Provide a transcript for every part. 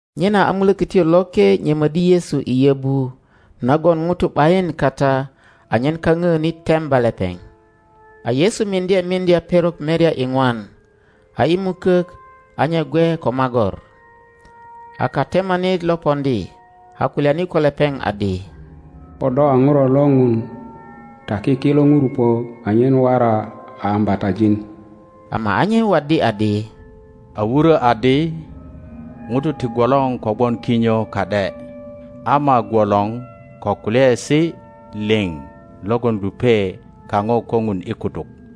Nyena a Mulokötyo Loke nyömöddi Yesu i yöbu nagon ŋutu ’bayin kata anyen kaŋöönit temba lepeŋ. A Yesu miŋdye miŋdya perok merya iŋwan, a i mukök a nye gwe ko magor. A katemanit lo poŋdi, a kulyani ko lepeŋ adi, Ko do a Ŋuro lo Ŋun taki kilo ŋurupö anyen wora a ambatajin. Ama a nye waddi adi, A wurö adi, ŋutu ti gwolor kogwon kinyo ka ’de, ama gwolor ko kulyaesi liŋ logon lupe kaŋo ko Ŋun i kutuk,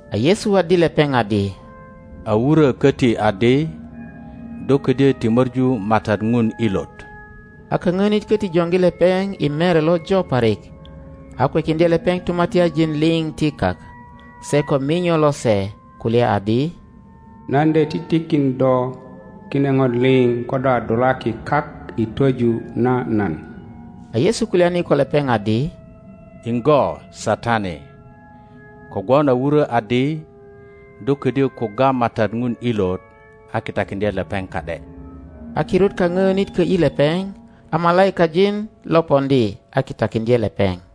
A Yesu waddi lepeŋ adi, A wuro koti adi, Do ködyö ti möŋu MATAT Ŋun ilot. A kaŋöönit köti joŋgi lepeŋ i inere lojo parik, a kwekiŋdye lepeŋ tumatya-njin liŋ ti kak, se ko minyo lose; kulya adi, Nan de titikin do kine ŋo liŋ ko do a dulaki kak i twoju na nan. A Yesu kulyani ko lepeŋ adi, Iŋgo, Satani! kogwon a wurö adi, Do ködyö kugga MATAT Ŋun ilot a kitakiŋdye lepeŋ ka ’de. A kirut kaŋilonit kö ’yi lepeŋ, a malaikajin lo poŋdi a kitakiŋdye lepeŋ.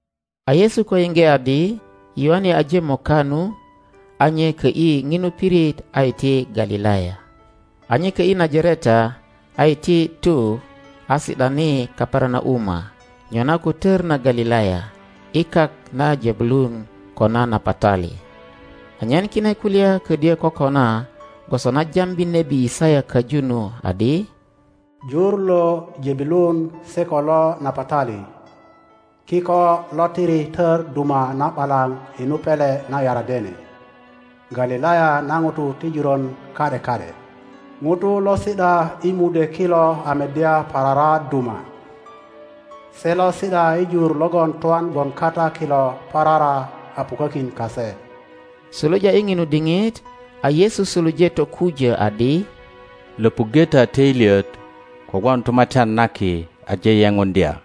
A Yesu ko yiŋge adi Yoane aje moka nu, a nye kö ’yi ŋinu pirit a iti Galilaya. A nye kö ’yi Najareta, a iti tu a si ’dani Kaperanauma nyona ko tor na Galilaya, i kak na Jebulun ko na Napatali, anyen kine kulya ködyö kokona gwoso na jambi nebi Yisaya köju nu adi, Jur lo Jebulun se ko lo Napatali, kiko lo tiri tör duma na ’balaŋ inu pele na Yardene, Galilaya na ŋutu ti juron ka ’de ka ’de— ŋutu lo si ’da i mudwe kilo a meddya parara duma, se lo si ’da i jur logon twan gwon kata kilo parara a pukökin kase. Suluja i ŋinu diŋit a Yesu suluje tokujö adi, Löpuŋge ta töilyet, kogwon Tumatyan na Ki aje yepuŋdya.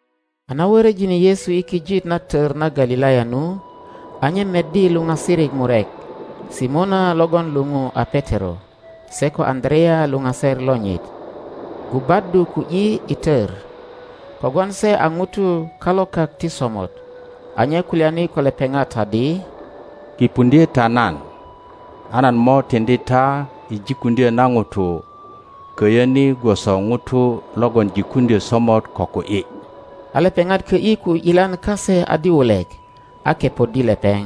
A na wöröjine Yesu i kijit na tor na Galilaya nu, a nye meddi luŋasirik murek, Simona logon luou a Petero, se ko Aŋöarea luŋaser lonyit, gubaddu ku ’yi i tör, kogwon se a ŋutu kalokak ti somot. A nye kulyani ko lepeŋat adi, Kipuŋdye ta nan, a nan mo tiŋdi ta i jikuŋdyö na ŋutu köyö ni gwoso ŋutu logon jikuŋdyö somot ko ku ’yi. a lepeŋat kö ’yi ku ’yilan kase adi wulek, a kepoddi lepeŋ.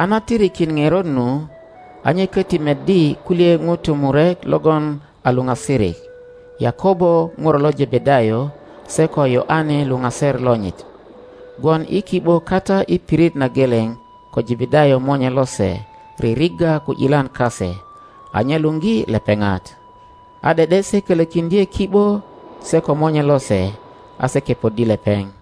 A na tirikin ŋeröt nu, a nye köti meddi kulye ŋutu murek logon a luŋasirik, Yakobo ŋuro lo Jebedayo se ko Yoane luŋaser lonyit, gwon i ki ’bo kata i pirit na geleŋ ko Jebedayo monye lose ririgga ku ’yilan kase. A nye luŋgi lepeŋat? A de ’de se kölökiŋdye ki ’bo se ko monye lose, a se kepoddi lepeŋ.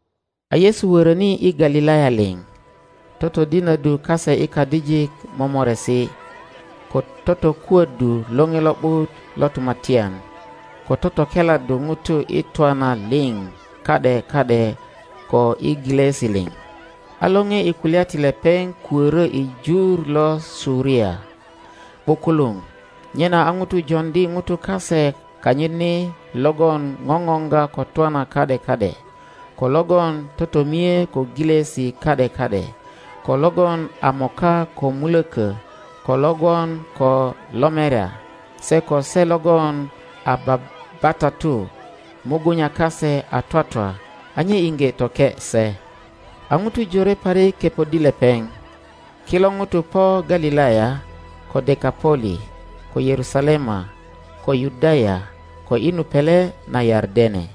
A Yesu wöröni i Galilaya liŋ, totodinöddu kase i kadijik momoresi, ko totokuöddu Loŋe Lo ’but lo Tumatyan, ko totokeladdu ŋutu i twana liŋ ka ’de ka ’de ko i gilösi liŋ, a lore i kulya ti lepeŋ kuörö i jur lo Suria ’bukuluŋ, nyena a ŋutu joŋdi ŋutu kase kanyit ni logon ŋoŋoŋga ko twana ka ’de ka ’de, ko logon totomie ko gilosi ka ’de ka ’de, ko logon a moka ko mulökö, ko lo gwon ko lomerya, se ko se logon a babatatu mugunya kase a twatwa, a nye iŋge toke se. a ŋutu jore parik kepoddi lepeŋ. Kilo ŋutu po Galilaya, ko Dekapoli, ko Yerusalema, ko Yudaya, ko i nu pele na Yardene.